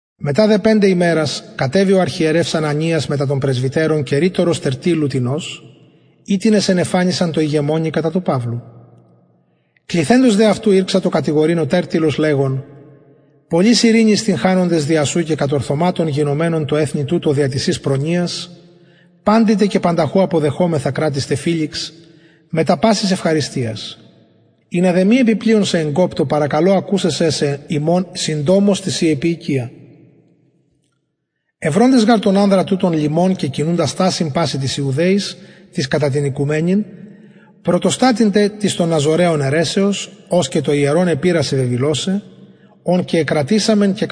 μετα δε πεντε ημερας κατεβη ο αρχιερευς ανανιας μετα των πρεσβυτερων και ρητορος τερτυλλου τινος οιτινες ενεφανισαν τω ηγεμονι κατα του παυλου κληθεντος δε αυτου ηρξατο κατηγορειν ο τερτυλλος λεγων πολλης ειρηνης τυγχανοντες δια σου και κατορθωματων γινομενων τω εθνει τουτω δια της σης προνοιας παντη τε και πανταχου αποδεχομεθα κρατιστε φηλιξ μετα πασης ευχαριστιας ινα δε μη επι πλειον σε εγκοπτω παρακαλω ακουσαι σε ημων συντομως τη ση επιεικεια ευροντες γαρ τον ανδρα τουτον λοιμον και κινουντα στασιν πασιν τοις ιουδαιοις τοις κατα την οικουμενην πρωτοστατην τε της των ναζωραιων αιρεσεως ος και το ιερον επειρασεν βεβηλωσαι ον και εκρατησαμεν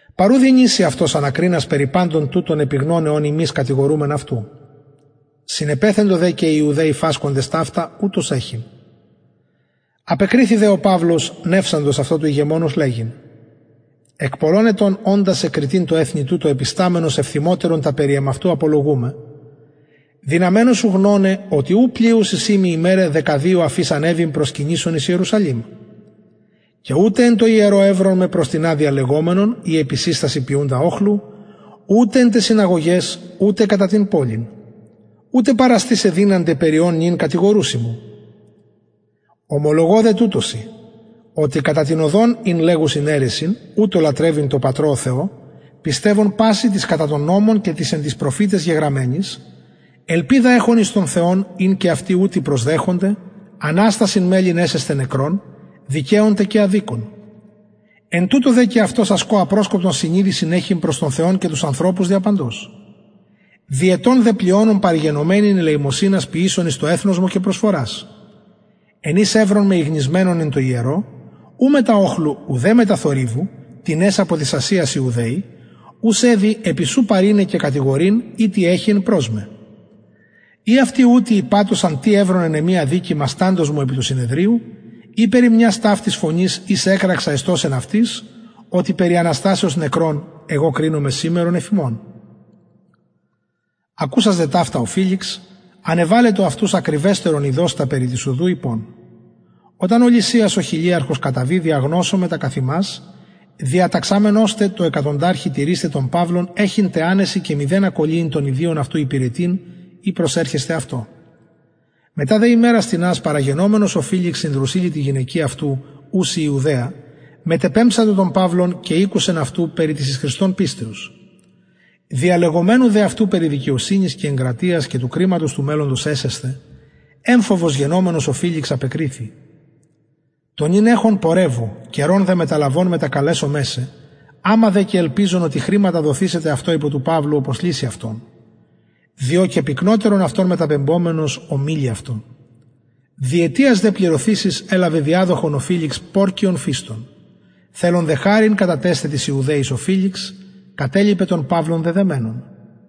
παρ ου δυνηση αυτος ανακρινας περι παντων τουτων επιγνωναι ων ημεις κατηγορουμεν αυτου συνεπεθεντο δε και οι ιουδαιοι φασκοντες ταυτα ουτως εχειν απεκριθη δε ο παυλος νευσαντος αυτω του ηγεμονος λεγειν εκ πολλων ετων οντα σε κριτην τω εθνει τουτω επισταμενος ευθυμοτερον τα περι εμαυτου απολογουμαι δυναμενου σου γνωναι οτι ου πλειους εισιν μοι ημεραι δεκαδυο αφ ης ανεβην προσκυνησων εν ιερουσαλημ και ουτε εν τω ιερω ευρον με προς τινα διαλεγομενον η επισυστασιν ποιουντα οχλου ουτε εν ταις συναγωγαις ουτε κατα την πολιν ουτε παραστησαι με δυνανται περι ων νυν κατηγορουσιν μου ομολογω δε τουτο σοι οτι κατα την οδον ην λεγουσιν αιρεσιν ουτως λατρευω τω πατρωω θεω πιστευων πασιν τοις κατα τον νομον και τοις προφηταις γεγραμμενοις ελπιδα εχων εις τον θεον ην και αυτοι ουτοι προσδεχονται αναστασιν μελλειν εσεσθαι νεκρων δικαιων τε και αδικων εν τουτω δε αυτος ασκω απροσκοπον συνειδησιν εχων προς τον θεον και τους ανθρωπους δια παντος δι ετων δε πλειονων παρεγενομην ελεημοσυνας ποιησων εις το εθνος μου και προσφορας εν οις ευρον με ηγνισμενον εν τω ιερω ου μετα οχλου ουδε μετα θορυβου τινες απο της ασιας ιουδαιοι ους δει επι σου παρειναι και κατηγορειν ει τι εχοιεν προς με η αυτοι ουτοι ειπατωσαν τι ευρον εν εμοι αδικημα σταντος μου επι του συνεδριου η περι μιας ταυτης φωνης ης εκραξα εστως εν αυτοις οτι περι αναστασεως νεκρων εγω κρινομαι σημερον υφ υμων ακουσας δε ταυτα ο φηλιξ ανεβαλετο αυτους ακριβεστερον ειδως τα περι της οδου ειπων οταν λυσιας ο χιλιαρχος καταβη διαγνωσομαι τα καθ υμας διαταξαμενος τε τω εκατονταρχη τηρεισθαι τον παυλον εχειν τε ανεσιν και μηδενα κωλυειν των ιδιων αυτου υπηρετειν η προσερχεσθαι αυτω μετα δε ημερας τινας παραγενομενος ο φηλιξ συν δρουσιλλη τη γυναικι ουση ιουδαια μετεπεμψατο τον παυλον και ηκουσεν αυτου περι της εις χριστον πιστεως διαλεγομενου δε αυτου περι δικαιοσυνης και εγκρατειας και του κριματος του μελλοντος εσεσθαι εμφοβος γενομενος ο φηλιξ απεκριθη το νυν εχον πορευου καιρον δε μεταλαβων μετακαλεσομαι σε αμα και ελπιζων οτι χρηματα δοθησεται αυτω υπο του παυλου οπως λυση αυτον διο και πυκνοτερον αυτον μεταπεμπομενος ωμιλει αυτω διετιας δε πληρωθεισης ελαβεν διαδοχον ο φηλιξ πορκιον φηστον θελων τε χαριτας καταθεσθαι τοις ιουδαιοις ο φηλιξ κατελιπεν τον παυλον δεδεμενον